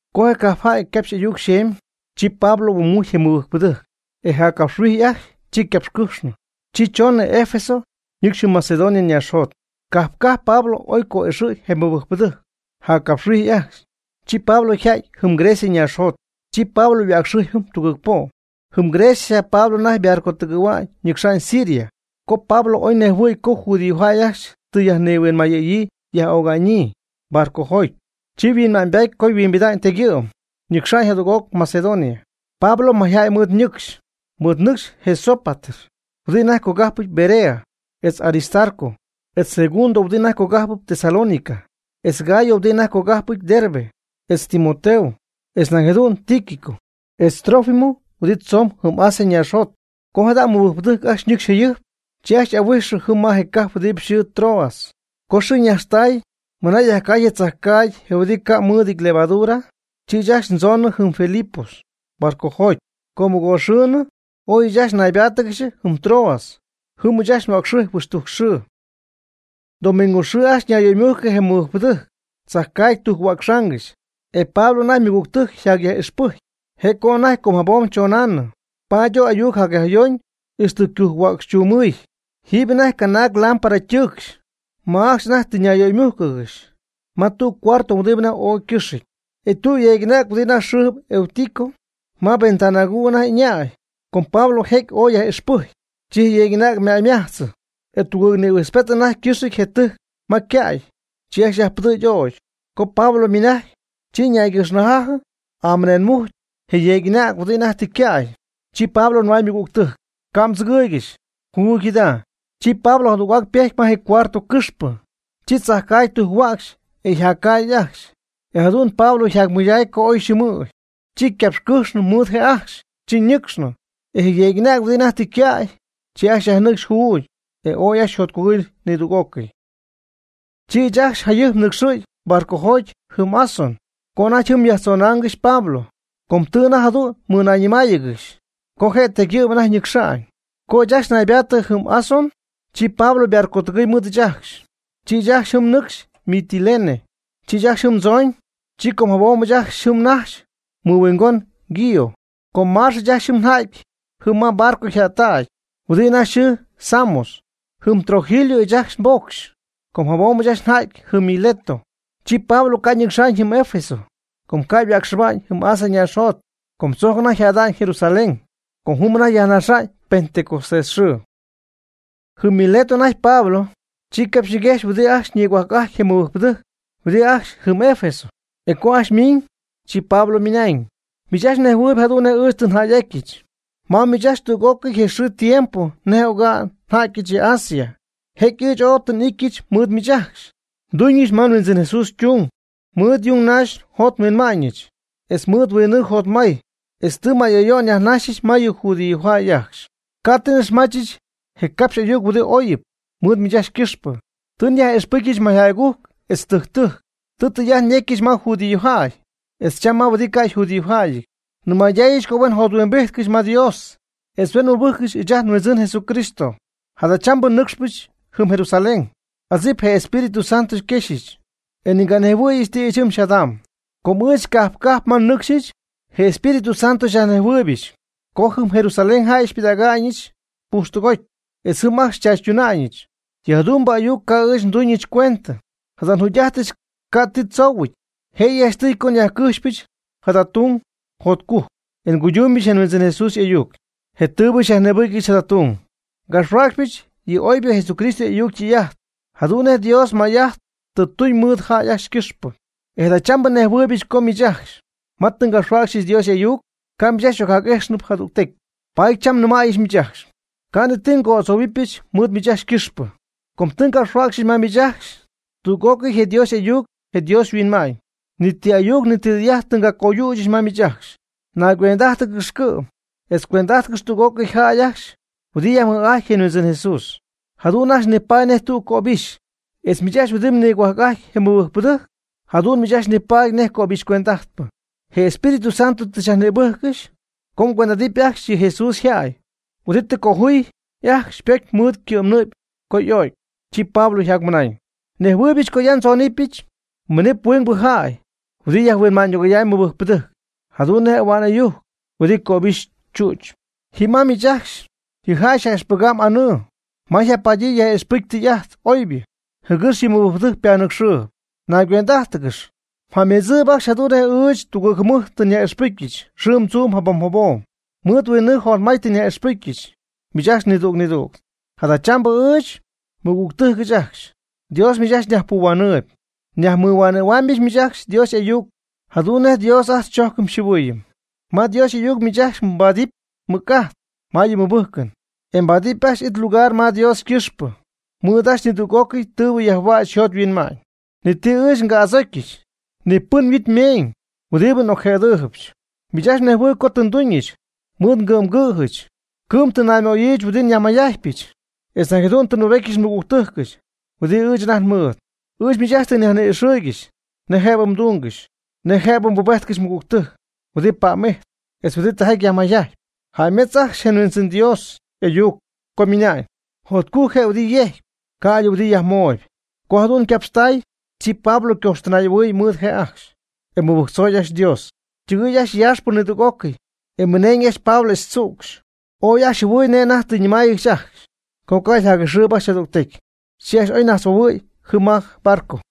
Co je cajp jäy ycapxy'ayuc xeemy, chi Pablo huoomujcy je mɨbɨjcpɨdɨjc, e jaccapxhuijy ajcxy chi ycapxycɨjxnɨ, chi choonɨ Efeso ñɨcxy jɨm Macedonia ñaaxjot. Cajp cajp Pablo oy co'ixɨy je mɨbɨjcpɨdɨjc jaccapxhuijy ajcxy. Chi Pablo yja'ty jɨm Grecia ñaaxjot. Chi Pablo yhuäcxɨjpy jɨm tugɨɨg po'. Jɨm Grecia Pablo anajty ybarcotɨgɨ̈hua'ñ ñɨcxa'ñ Siria. Co Pablo oy nejhuɨ̈y co judíojäy ajcxy tɨ yajnihuinmayɨ̈yii yaj'öga'ñyii barcojoty, chi yhuinma'ñybaty co huimbida'ñ tegyɨ'm, ñaxa'ñ jadüg'oc Macedonia. Pablo mayjäy mɨɨd ñɨcxy, mɨɨdnɨcxy je Sópater huɨdi anajty cogajp Berea, etz Aristarco, etz Segundo huɨdi anajty cogajp Tesalónica, etz Gayo huɨdi anajty cogajp Derbe, etz Timoteo, etz nañ jadu'n Tíquico, etz Trófimo huɨdi tzoon jɨm Asia ñaaxjot. Co jada mɨbɨjcpɨdɨjc ajcxy ñɨcxy jayɨjp, chi ajcxy xy'ahuijxyɨch jɨm ma je cajp huɨdi xɨɨ Troas. Co xɨɨ ñajxtay mɨna yajcaay je tzajcaagy je huɨdi ca' mɨɨdɨty levadura, chi ɨɨch ajcxy ndzoonɨ jɨm Filipos barcojoty. Co mɨgoox xɨɨnɨ, oy ɨɨch ajcxy naybáatɨgɨxy jɨm Troas. Jɨm ɨɨch ajcxy yhuäcxɨjpy huixtujc xɨɨ. Domingo xɨɨ ajcxy ñayyöymujcɨ je mɨbɨjcpɨdɨjc chajcaagy ytujc-huäcxaangɨxy, e Pablo anajty ymɨgügtɨjc yjacyaj'ixpɨjcpy. Je' co anajty com jabom chonaanɨ, paady oy ayuc jacyajyoñ ixtɨ ycujc-hua'cxchumɨɨy. Jiiby anajty canaag lámpara ytɨɨcxy ma ajcxy anajty tɨ yöymujccɨxy ma tüg cuarto huɨdi anajty oy ycɨxɨty. E tüg yeeg'anäg huɨdi anajty yxɨɨ Eutico, ma ventana aguu anajty y'ɨñäy. Com Pablo jecy oy yaj'ixpɨjcy, chi je yeeg'anäg ymäymajtzɨ, e tugɨɨg nïhuijtzpety anajty ycɨxɨty je tɨjc ma ycäy. Chi ajcxy yajpɨdɨ̈gy ögy. Co Pablo ymɨnajcy, chi ñaygɨjxnajajɨ amɨneenmujcy je yeeg'anäg huɨdi anajty tɨ ycäy. Chi Pablo nɨmay ymɨgügtɨjc: ―Ca' mdzɨgɨɨygɨxy, juugy jada. Chi Pablo jadüg'oc ypejty ma je cuarto cɨxpɨ, chi chajcaagy tujc-huäcxy e yajcaay ajcxy, e jadu'n Pablo yjacmɨydacy co oy xɨɨmɨɨyñ. Chi ycapxycɨjxnɨ mɨɨd je' ajcxy, chi ñɨcxnɨ. E je yeeg'anäg huɨdi anajty tɨ ycäy, chi ajcxy yajnɨcxy juugy, e ooy ajcxy yjotcugɨy nidüg'ócɨy. Chi ɨɨch ajcxy jayɨjp nɨcxɨ̈gy barcojoty jɨm Asón co anajty jɨm nyajtzonáangɨxɨch Pablo, com tɨ anajty jadu'n mɨɨdnayñɨmáayɨgɨxɨch co je' tegyɨ'm anajty ñɨcxa'ñ. Co ɨɨch ajcxy naybaattɨ jɨm Asón, chi Pablo ybarcotɨgɨɨy mɨɨd ɨɨch ajcxy. Chi ɨɨch ajcxy ñɨcxy jɨm Mitilene. Chi ɨɨch ajcxy jɨm ndzoñ, chi com jabom ɨɨch ajcxy najxy mɨhuingon Quío, comaax ɨɨch ajcxy nja'ty jɨm ma barco jättac huɨdi anajty yxɨɨ Samos. Jɨm Trogilio ɨɨch ajcxy nbocxy, com jabom ɨɨch ajcxy nja'ty jɨm Mileto. Chi Pablo ca' ñɨcxa'ñ jɨm Efeso co ca' yhuäcxɨba'ñ jɨm Asia ñaaxjot, com tzojc anajty yjäda'ñ Jerusalén, com jɨm anajty yajnaxa'ñ Pentecostés xɨɨ. Jɨm Mileto anajty Pablo, chi capxyñiguejxy huɨdi ajcxy nigohuajc'ajtp je mɨbɨjcpɨdɨjc huɨdi ajcxy jɨm Efeso. E co ajcxy miiñ, chi Pablo ymɨnañ: ―Miich ajcxy mnejhuɨɨyb jadu'n nej ɨɨch tɨ njäy'atyɨch ma miich ajcxy tüg'ócɨy je xɨɨ je tiempo nej oga'n nja'tyɨch ya Asia. Jecy ɨɨch ooy tɨ n'ityɨch mɨɨd miich ajcxy, nduñɨch ma nHuindzɨn Jesús ytung mɨɨd yung naxy njot nhuinma'ñɨch, etz mɨɨd huinnɨɨ jotmay, etz tɨ may ayo'n nyajnaxyɨch ma yɨ judíojäy ajcxy. Ca' tɨ n'ixmachɨch je ngapx'ayuc huɨdi oyɨp mɨɨd miich ajcxy ycɨxpɨ. Tɨ nyaj'ixpɨcyɨch mayjäy'agujc etz tɨjc tɨjc. Tɨ ndɨy'ajt yecyɨch ma judíojäy etz cham ma huɨdi ca' yjudíojäyɨty. Nnɨmaydaayɨch co huen jothuimbijtcɨxy ma Dios, etz huen mɨbɨjccɨxy ɨɨch ajt nHuindzɨn Jesucristo. Jadachambɨ nɨcxpɨch jɨm Jerusalén; adzip je Espíritu Santo xyquexyɨch e ni nganejhuɨ̈yɨch ti ɨɨch jɨm xyjadamy. Co ɨɨch cajp cajp ma nnɨcxyɨch, je Espíritu Santo xyajnejhuɨɨybɨch co jɨm Jerusalén jäy ajcxy xypɨdäga'ñɨch pujxtɨgoty etz jɨm ajcxy xychaachytuna'ñɨch. Yɨ jadu'mbɨ ayuc ca' ɨɨch nduñɨch cuendɨ, jada njugy'ajtɨch ca' ti tzoohuɨty. Jëyɨ janchtɨy co nyajcɨxɨpyɨch jada tung jotcujc, e nguydunɨpyɨch je Huindzɨn Jesús y'ayuc, je tɨɨbɨ xyajnïbɨcyɨch jada tung. Ngapxhuäcxɨbɨch yɨ oybɨ Jesucristo y'ayuc ytɨy'ajt jadu'n nej Dios may'ajt tɨ tuñ mɨɨd jäy ajcxy ycɨxpɨ. E jadachambɨ nnejhuɨɨybɨch co miich ajcxy ma tɨ ngapxhuäcxyɨch Dios y'ayuc, ca' miich ajcxy xy'ocjac'íjxcɨxnɨ jadügtecy. Paady cham nnɨmäyɨch miich ajcxy, ca' ni ti ngo'adzohuɨpyɨch mɨɨd miich ajcxy ycɨxpɨ. Com tɨ ngapxhuäcxyɨch ma miich ajcxy tüg'ócɨy je Dios y'ayuc je Dios yhuinma'ñ. Ni ti ayuc ni ti ytɨy'ajt tɨ ngacoyüchɨch ma miich ajcxy. Naycuend'ájtɨgɨxy cɨ'm etz cuend'ajtcɨxy tüg'ócɨy jäy ajcxy huɨdi yajmɨj'ajtp je Huindzɨn Jesús, jadu'n ajcxy nipaady nej tügpɨcy cöbɨxy, etz miich ajcxy huɨdi nigohuajc'ajt je mɨbɨjcpɨdɨjc jadu'n miich ajcxy nipaady nej cöbixy cuend'ajtpɨ. Je Espíritu Santo tɨ xyajnïbɨ́jccɨxy co mgüend'adɨpy ajcxy yɨ Jesús yjäy, huɨdi tɨ cojuuy ajcxy ypocy mɨɨd ycɨ'mnɨ'py co y'o'cy. Chi Pablo yjacmɨnañ: ―Nejhuɨɨybɨch co ya ndzóonɨbɨch miinɨp huingbɨ jäy huɨdi yajhuinma'ñydɨgoyam mɨbɨjcpɨdɨjc, jadu'n nej ahua'n ɨyujc huɨdi cöbixy tzüdzɨp. Ji ma miich ajcxy ji jäy yaj'ixpɨgam anɨɨ ma yjapadyii yaj'ixpɨgɨpy tɨy'ajt oybɨ jɨgɨx yɨ mɨbɨjcpɨdɨjc ypanɨcxɨɨyb. Naygüend'ájtɨgɨx, mjäymedzɨɨyb ajcxy jadu'n nej ɨɨch tugɨɨg jɨmɨjt tɨ nyaj'ixpɨcyɨch xɨɨm tzuum jabom jabom, mɨɨd huinnɨɨ jotmay tɨ nyaj'ixpɨjccɨxy miich ajcxy nidüg nidüg. Jadachambɨ ɨɨch, nmɨgügtɨjcɨch ajcxy, Dios miich ajcxy nyajpuhuanɨɨyb, nyajmɨhuɨ'maamyɨch miich ajcxy Dios y'ayuc jadu'n nej Dios ajt xychojcɨm xyjɨhuɨɨyɨm. Ma Dios y'ayuc miich ajcxy mbaadɨpy mɨc'ajt ma yɨ mɨbɨjcɨn, e mbaadɨpy ajcxy it lugar ma Dios quipxyɨ mɨɨd ajcxy nidüg'ócɨy tɨɨbɨ yajhuäch yjot yhuinma'ñ. Ni ti ɨɨch tɨ nga'adzocy, ni pɨn yhuit ymeeñ huɨdibɨ n'ocjëdɨɨybɨch. Miich ajcxy mnejhuɨɨyb co tɨ nduñɨch, mɨɨd ngɨ'mgɨ̈jɨch cɨ'm tɨ nnaymöyiijɨch huɨdi nyajmayjajtpyɨch etz nañ jadu'n tɨ nbubetyɨch nmɨgügtɨjcɨch huɨdi ɨɨch anajty nmɨɨd. Ɨɨch miich ajcxy tɨ nyajni'ixɨɨygɨxy nej jëbɨ mdungɨxy, nej jëbɨ mbubéjtcɨxy mɨgügtɨjc huɨdi pa'm'ijtp, etz huɨdi tijaty yajmayjajtp. Jäymedzɨɨ ajcxy je Huindzɨn Dios y'ayuc co ymɨnañ: “Jacjotcujc je' huɨdi yejcp, ca'ydɨ huɨdibɨ yajmooyb.” Co jadu'n ycapxtay, chi Pablo ycoxtɨnay'ahuɨɨy mɨɨd je' ajcxy, e mɨbɨjctzoy ajcxy Dios. Ytɨgɨɨy ajcxy yaaxpɨ nidüg'ócɨy, e mɨneeñ ajcxy Pablo etz tzücxy. Ooy ajcxy jɨhuɨɨy nej anajty tɨ ñɨmáayɨgɨxy ajcxy co ca' yjac'ixɨɨyb ajcxy jadügtecy. Chi ajcxy oy najtzhuohuɨɨy jɨm ma barco.